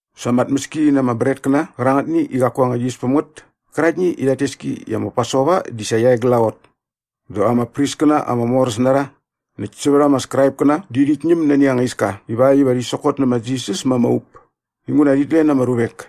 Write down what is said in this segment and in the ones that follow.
Sa ama tmäski na ama bretkäna qärangätni i qaku anga yis päm ngät käraktni i rhat tes ki i ma Pasova di sa qia e glaqot dä ama priskäna ama moräs na rha näkt sävät ama Skraipkäna di rhit ñäm nani anga iska iva rhi sokot nä ma Jisas ma ama up inguna rhit len ama ruvek.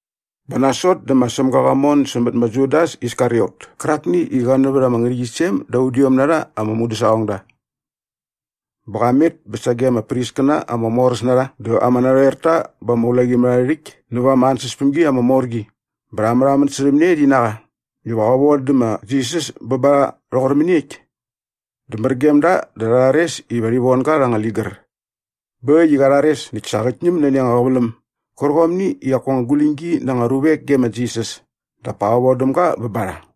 Bä nasot dä ma Sämga qa mon sämät ma Judas Iskariot kärakni i qa nävät ama ngärhäqyisem da udiom na rha ama mudäsaqongda. Bä qa met bä sage ama priskäna ama moräs na rha dä ama narhoerta bä ama ulaqimärharhärhäkt näva ama ansäspämgi ama mor qi bä rha märhamän särhäm ne rhi na qa iva qä vodä ma Jisas bä ba rha rhoqor mäniekt. Dä mär gem da dä rha rhares iva rhi von ga rha anga ligär. Bä äkt i qa rhares näkt sa qät ñäm nani anga qäväläm gärqomni i qaku anga guläñgi na anga ruvek ge ma Jisas dap pa qä vodäm ga bä ba rha.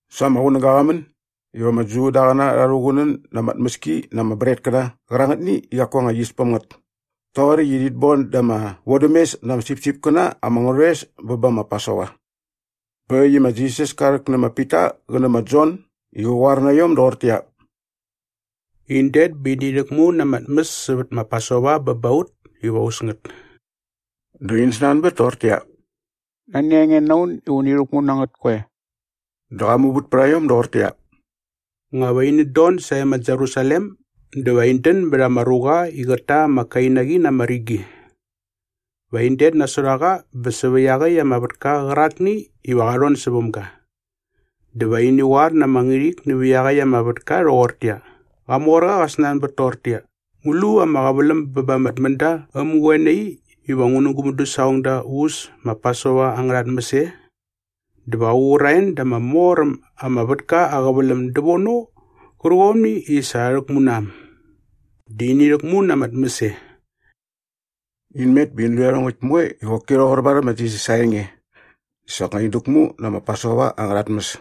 Sa ama qunäga qa män iva ama Judaqäna rha rhuqunän na ama tmäski na ama bretkäna qärangätni i qaku anga yis päm ngät toqoräkt i rhit boda ama vodämes na ama sipsipkäna ama ngärhoes bä bä ma Pasova. Bä äkt i ma Jisas ka rhäk nä ma Pita qä nä ma Jon i qä qoar na iom doqortäqyia, “In det bä ini rhäkmu na ama tmäs sävät ma Pasova bä ba ut iva u äs ngät.” Dä in snanbät toqortäqyia, “Nani a nge na un iva uni rhäkmu nä ngät koe?” Dä qa muvät pät a iom doqortäqyia, “Nga va inät don sae ma Jerusalem dä va in dän bät ama ruqa i qät ta ama kainaqi na ama rigi. Va in det nasot a qa bä sävä iaqäkt ama vätka qärakni iva qa rhon säväm ga. Dä va ini qoar na ama ngärhik nävä iaqäkt ama vätka rhoqortäqyia, ‘Qamorqa qä snanbät toqortäqyia, ngu lu ama qäväläm bä ba ama tmända äm ngä qoe nai iva ngu nä gu mudäsaqongda u äs ma Pasova angärha tmäs e?’ Dä va qä qur a en da ama mor äm ama vätka aa qäväläm dävono qärqomni i sa rha rhäkmu na äm. Dä ini rhäkmu na ama tmäski e.” In met bä in lu iarhongäkt moe i qoki rhoqor varhäm ma Jisas aa enge. Dä soknga in däkmu nä ma Pasova angärha tmäs.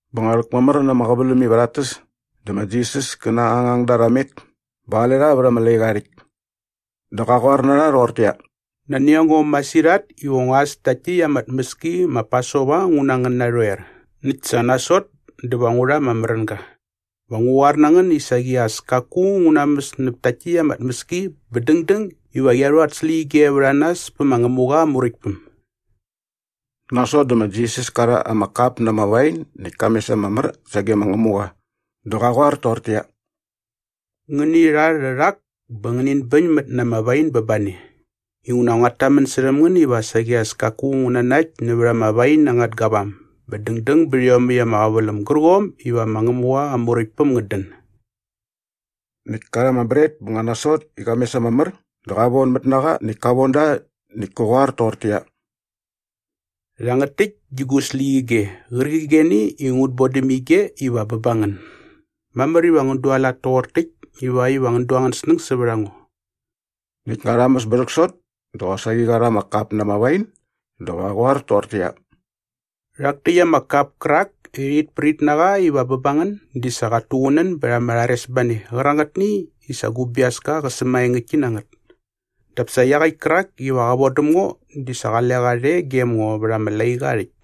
Bä nga rhäkmamär na ama qäväläm iva rhat täs dä ma Jisas kä na aa ngangda rha met bä qale rha vät ama laiqa aa rhäkt. Dä qa qoar na rha rhoqortäqyia, “Nani a ngo masirhat iva ngua äs takt täkt ama tmäski ma Pasova ngu na ngän narhoer näkt sa nasot dä va ngu rha ama märänga. Va ngu qoar na ngän i saqi as kaku ngu namäs näp takt täkt ama tmäski bä dängdäng iva qia rhu at släqyige vät a nas pä ma Ngämuqa aa Muräktpäm.” Nasot dä ma Jisas ka rha ama kap na ama wain näkt ka mes ama mär sage ma Ngämuqa dä qa qoar toqortäqyia, “Ngäni rha rhärhak bä ngänin bäñmät na ama wain bä ba ne. Inguna nguat tamän särhäm ngän iva saqi as kaku ngu nanakt nävät ama wain angät gavam bä dängdäng bät iomäkt ama qäväläm gärqomni iva ma Ngämuqa aa Muräktpäm ngät dän.” Näkt ka rha ama bret bä nga nasot i qa mes ama mär dä qa vonamät na qa näkt ka von da näkt kä qoar toqortäqyia, “Rhangät täkt di gu släqyige qärqigeni i ngut bodäm ige iva bä ba ngän. Mamär iva ngän dualat toqor täkt ivakt iva ngän du angän snäng sävät a ngo.” Näkt nga rha mäs bä rhäksot dä qosaqi qa rha ama kap na ama wain dä qa qoar toqortäqyia, “Rhak täkt ama kap kärakni i rhit prit na qa iva bä ba ngän di sa qat tuqunän bät ama rharesbane qärangätni i sa gu biaska qa sämaengäktki na ngät. Dap sa iaqäkt kärak iva qä vodäm ngo di sa qale qa rhe gem ngo vät ama laiqa aa rhäkt.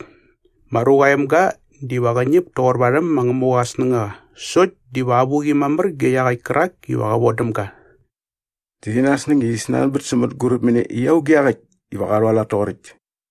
Ma Ruqa aa Emga diva qä ñäp toqor varhäm ma Ngämuqa aa snängaqa sokt diva avuqi mamär ge iaqäkt kärak iva qä vodäm ga.” Dä rhi nasäng i rhi snanbät sä mänguräp mä ne i auge iaqäkt iva qa rhualat toqoräkt.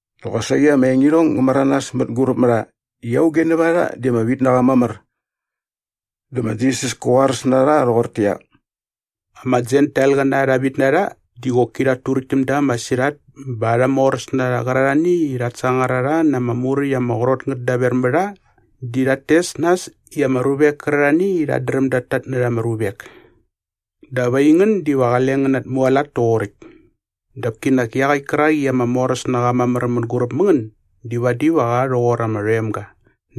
Dä qosaqi ama engirhong ngä märanas mänguräp mä rha i auge nävät a rha di ama vit na qa mamär. Dä ma Jisas kä qoaräs na rha rhoqortäqyia, “Ama Jentailqäna arha vitnarha di qoki rhat turäkt täm da masirhat bä arha moräsnarha qärarhani i rhat sangar a rha na ama muräkt ama qrot ngät daver mä rha di rhat tes nas i ama ruvek kärarhani i rhat dräm dat tatnärha ama ruvek. Dap aingän diva qale ngän natmualat toqoräkt. Dap kinak iaqäkt kärak i ama moräs na qa mamär mänguräp mä ngän di vadi va qa rhoqor ama rhoemga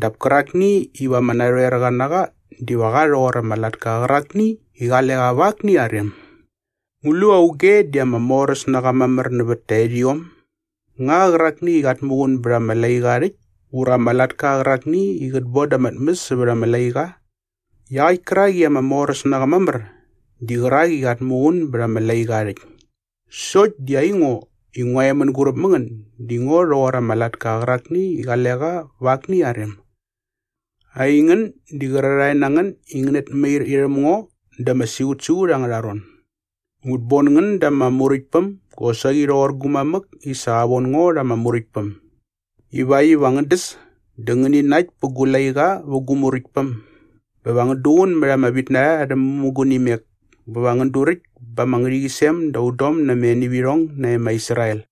dap kärakni iva ama narhoerqa na qa diva qa rhoqor ama latka qärakni i qale qa va akni aa rem. Ngu lu auge di ama moräs na qa mamär nävät taerhiom? Nga qärakni i qat muqun bät ama laiqa aa rhäkt ura ama latka qärakni i qät boda ama tmäs sävät ama laiqa? Iaqäkt kärak i ama moräs na qa mamär di qärak i qat muqun bät ama laiqa aa rhäkt. Sokt di aingo i ngua e mänguräp mä ngän di ngo rhoqor ama latka qärakni i qale qa va akni aa rem. “Aingän di qärarhae na ngän i ngänät mair irhäm ngo da ama siqutsiqut angärha ron. Ngut bon ngän dä ama Muräktpäm gosaqi rhoqor gu mamäk i sa qa von ngo rha ama Muräktpäm ivakt iva ngän däs dä ngäni nakt pät gu laiqa vä gu Muräktpäm bä va ngän duqun mät ama vitnarha arhä mämugunimek bä va ngän duräkt ba ama ngärhäqyisem da udom na ama enivirhong nae ma Israel.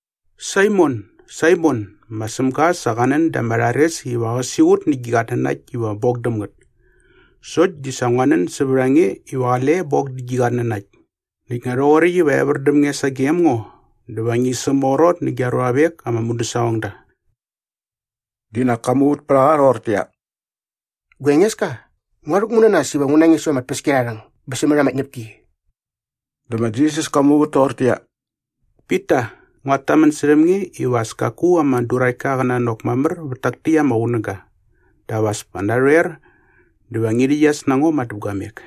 “Saimon, Saimon, ma Sämga sa qa nän da ama rhares iva qä siqut nä gi qatnanakt iva bok däm ngät. Sokt di sa ngua nän sävät a nge iva qale bok dä gi qatnanakt. Näkt nga rhoqoräkt iva evär däm nge sagem ngo dä va ngi sämaqrot nä gia ruavek ama mudäsaqongda.” Di nak ka muvät pät a qa rhoqortäqyia, “Gua Engeska, ngua rhäkmu na nas iva ngu na nge säva ama tpäskiarharhäng bä sämät ama tñäpki.” Dä ma Jisas ka muvät toqortäqyia, “Pita, nguat tamän särhäm nge iva as kaku ama duraktka qä nanok mamär vät tak täkt ama qunäga dap as pa narhoer dä va ngi rhäqyas na ngo madäpguamek.”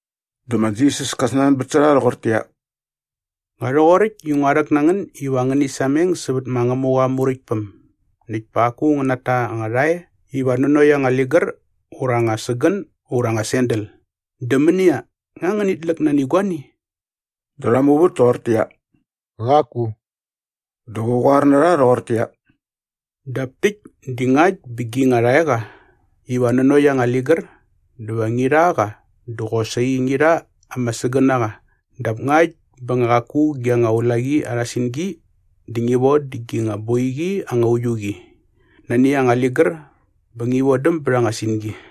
Dä ma Jisas ka snanbät sä rha rhoqortäqyia, “Nga rhoqoräkt i ngua rhäk na ngän iva ngäni sameng sävät ma Ngämuqa aa Muräktpäm näkt pa qaku ngän nata anga rhae iva nanokt anga ligär ura anga sägän ura anga sandal. Dä mänia, nga ngänit läk nani guani?” Dä rha muvät toqortäqyia, “Qaku.” Dä qä qoar na rha rhoqortäqyia, “Dap täkt di ngakt bä gi nga rhaeqa iva nanokt anga ligär dä va ngi rha qa dä qosaqi ngi rha ama sägänaqa dap ngakt bä nga qaku gi nga ulaqi arha singi dä ngi vodä gi nga boiqi anga uiu qi nani anga ligär bä va ngi vodäm bät anga singi.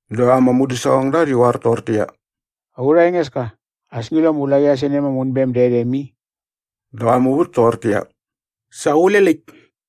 Dä ama mudäsaqongda rhi qoar toqortäqyia, “Aurha Engeska, as ngi lu ama ulaqi arha senem ama unbem dä erhem i.” Dä qa muvät toqortäqyia, “Sa qule läkt.”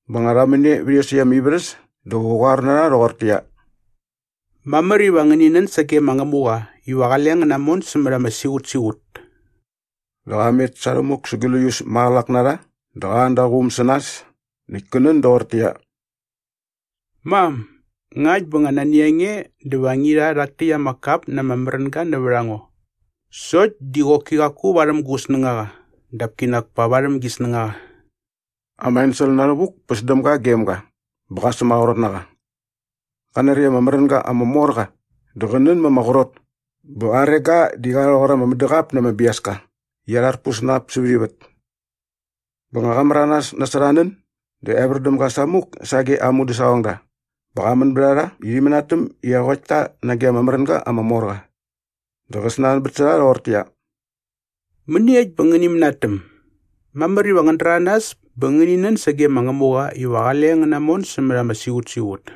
Bä nga rha män e vät iosäkt ama ivärhäs dä qä qoar na rha rhoqortäqyia, “Mamär iva ngäni nän sage ma Ngämuqa iva qale ngän namon sämät ama siqutsiqut.” Dä qa met sa rhämuk sa gläius maqälak na rha dä qa an da aa quum sä nas näkt kä nän doqortäqyia, “Mam, ngakt bä nga nani a nge dä va ngi rha rhak täkt ama kap na ama märänga nävät a ngo. Sokt di qoki qaku varhäm gu snängaqa dap kinak pa varhäm gi snängaqa.” Ama ensel na rhävuk päs däm ga gem ga bä qa sämaqrot na qa. Qa nari ama märänga ama mor qa dä qä nän mä ama qrot bä aa rega di qa rhoqor ama mädäqap na ama biaska i arharpus na ap sävät ivät. Bä nga qa märanas nasot aa nän dä evär däm ga samuk sage aa mudäsaqongda bä qa män bät a rha i rhi mänatäm i eqokt ta nage ama märänga ama mor qa. Dä qä snanbät sä rha rhoqortäqyia, “Mäniekt bä ngäni mänatäm? Mamär iva ngän däranas bä ngäni nän sage ma Ngämuqa iva qale ngän namon sämät ama siqutsiqut.”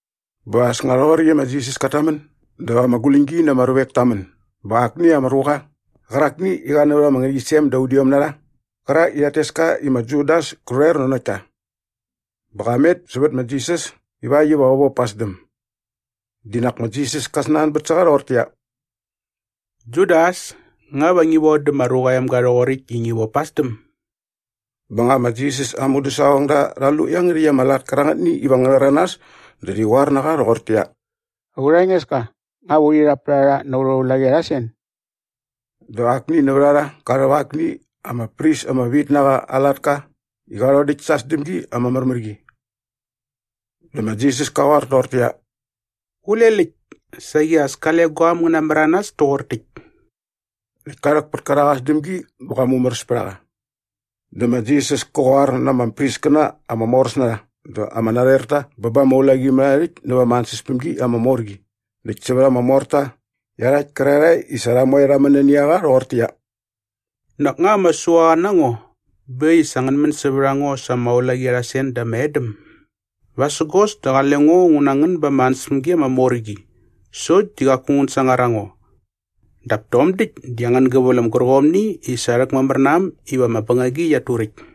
Bä as nga rhoqoräkt i ma Jisas kat tamän dä ama guläñgi na ama ruvek ta män bä akni ama ruqa qärakni i qa nävät ama ngärhäqyisem da udiom na rha qärak i rhat tes ka i ma Judas kä rhoer nanokt ta. Bä qa met sävät ma Jisas ivakt iva qä vop pa aa sdäm. Di nak ma Jisas ka snanbät sä qa rhoqortäqyia, “Judas, nga va ngi vodä ma Ruqa aa Emga rhoqoräkt i ngi vop pa aa sdäm?” Bä nga ma Jisas aa mudäsaqongda rha lu iangärhäkt ama lat kärangätni iva ngä rhäranas dä rhi qoar na qa rhoqortäqyia, “Aurha Engeska, nga va urhi rhap pät a rha na aurha ulaqi arha sen?” Dä akni nävät a rha qa rhäp akni ama pris ama vit na qa aa latka i qa rhodäkt sa aa sdämgi ama märmär qi. Dä ma Jisas ka qoar toqortäqyia, “Qule läkt! Saqi as kale guaäm ngä namäranas toqor täkt.” Näkt ka rhäk pät kärak aa sdämgi bä qa mumäräs pät a qa. Dä ma Jisas kä qoar na ama priskäna ama moräs na rha dä ama narhoerta bä ba ama ulaqimärharhärhäkt näva ama ansäspämgi ama mor qi näkt sävät ama morta iarhakt kärarhae i sa rha moe rha män nani a qa rhoqortäqyia, “Nak nga ama suaqa na ngo bä äkt i sa ngän män sävät a ngo sa ama ulaqi arha sen dä ama edäm? Vasägos dä qale ngo ngu na ngän ba ama ansäspämgi ama mor qi sokt di qaku ngän sangar a ngo. Dap tom däkt di angän gäväläm gärqomni i sa rhäkmamär na äm iva ama bängagi qiat turäkt.”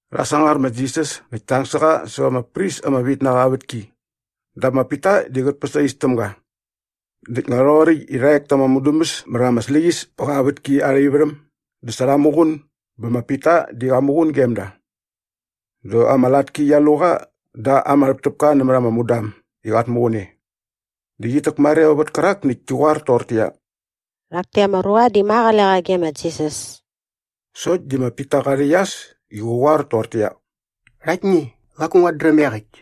Rha sangar ma Jisas näkt ta ang sä qa säva ama pris ama vit na qa aa vätki dap ma Pita di qät päsais täm ga. Näkt nga rhoqoräkt i rha ek ta ama mudäbäs mät ama släqyäs pä qa vätki arha ivärhäm dä sa rha muqun bä ma Pita di qa muqun gem da. Dä ama latki qia lu qa da ama rhäptäpka nämät ama mudam i qat muqun e. Dä qit täkmareo vät kärak näkt ki qoar toqortäqyia, “Rhak täkt ama ruqa di ma qale qa ge ma Jisas.” Sokt di ma Pita qa rhäqyas i qä qoar toqortäqyia, “Rhaktni, qaku nguat dräm iaqäkt.”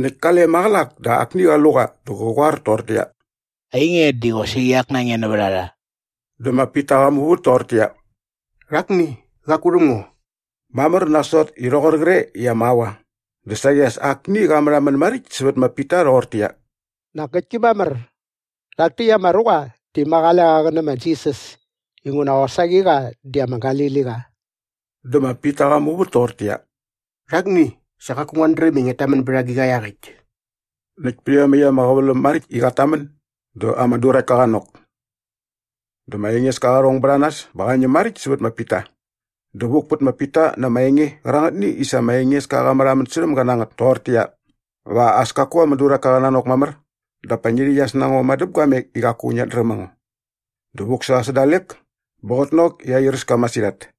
Näkt kale maqälak dä akni qa lu qa dä qä qoar toqortäqyia, “Ainge, di qosaqi ak na nge nävät a rha.” Dä ma Pita qa muvät toqortäqyia, “Rhakni, qaku rhäm ngo.” Mamär nasot i rhoqor qre i ama aua dä saqi as akni qa märhamän maräkt sävät ma Pita rhoqortäqyia, “Nak ngäktki mamär! Rhak täkt ama ruqa di ma qale qa qä nä ma Jisas inguna qosaqi qa di ama Galiliqa.” Dä ma Pita qa muvät toqortäqyia, “Rhakni, sa qaku nguat dräm i ngiat tamän bät agiqa iaqäkt.” Näkt pät iomäkt ama qäväläm maräkt i qat tamän dä ama duraktka qa nok. Dä ma Engeska qa rhong bät a nas bä qa ñäm maräkt sävät ma Pita. Dä vuk pät ma Pita na ama enge qärangätni i sa ma Engeska qa märhamän särhäm ga na ngät toqortäqyia, “Va as kaku ama duraktka qä nanok mamär dap pa ngi rhäqyas na ngo madäpguamek i qaku ngiat dräm a ngo.” Dä vuk sä qa sä dalek bä qät nok i airäs ka masirhat.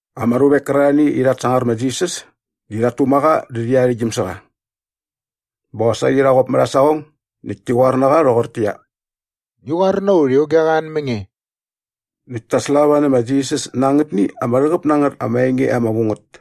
Ama ruvek kärarhani i rhat sangar ma Jisas di rhat tuma qa dä rhi arhäktgyäm sä qa. Bä qosaqi rha qop mät aa saqong näkt ti qoar na qa rhoqortäqyia, “Ngi qoar na ut i auge qa an mä nge!” Näkt ta slava nä ma Jisas na angätni ama rhäqäp na ngät ama enge ama vu ngät.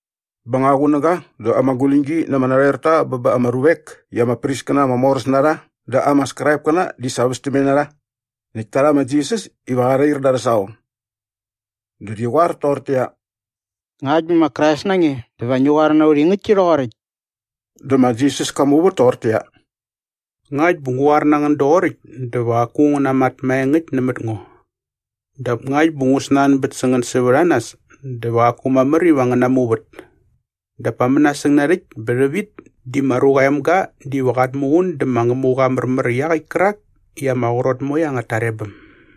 Bä nga qunäga dä ama guläñgi na ama narhoerta bä ba ama ruvek i ama priskäna ama moräs na rha dä ama Skraipkäna di sa västämne na rha näkt ta rha ma Jisas iva qa rhair da arhä saqong. Dä rhi qoar toqortäqyia, “Ngakt bä ma Krais na nge dä va ngi qoar na ut i ngäktki rhoqoräkt.” Dä ma Jisas ka muvät toqortäqyia, “Ngakt bä ngu qoar na ngän doqoräkt dä va qaku ngän namat maengäkt nämät ngo. Dap ngakt bä ngu snanbät sä ngän sävät a nas dä va qaku mamär iva ngän namuvät. Dap pa mänasäng narhäkt bä rhävit di ma Ruqa aa Emga diva qat muqun dä ma Ngämuqa aa märmär iaqäkt kärak i ama qrot moe angät tarebäm.”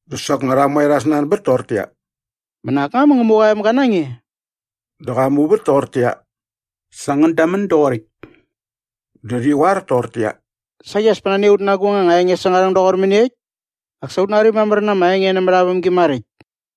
Dä soknga rha moe rha snanbät toqortäqyia, “Bä nak nga ma Ngämuqa aa emga na nge?” Dä qa muvät toqortäqyia, “Sa ngän damän doqoräkt.” Dä rhi qoar toqortäqyia, “Saqi as pa nani a ut na agung anga enge säng aa rhäng doqor mäniekt? Nak sa ut nari mamär na ama enge nämät aa vämgi maräkt.”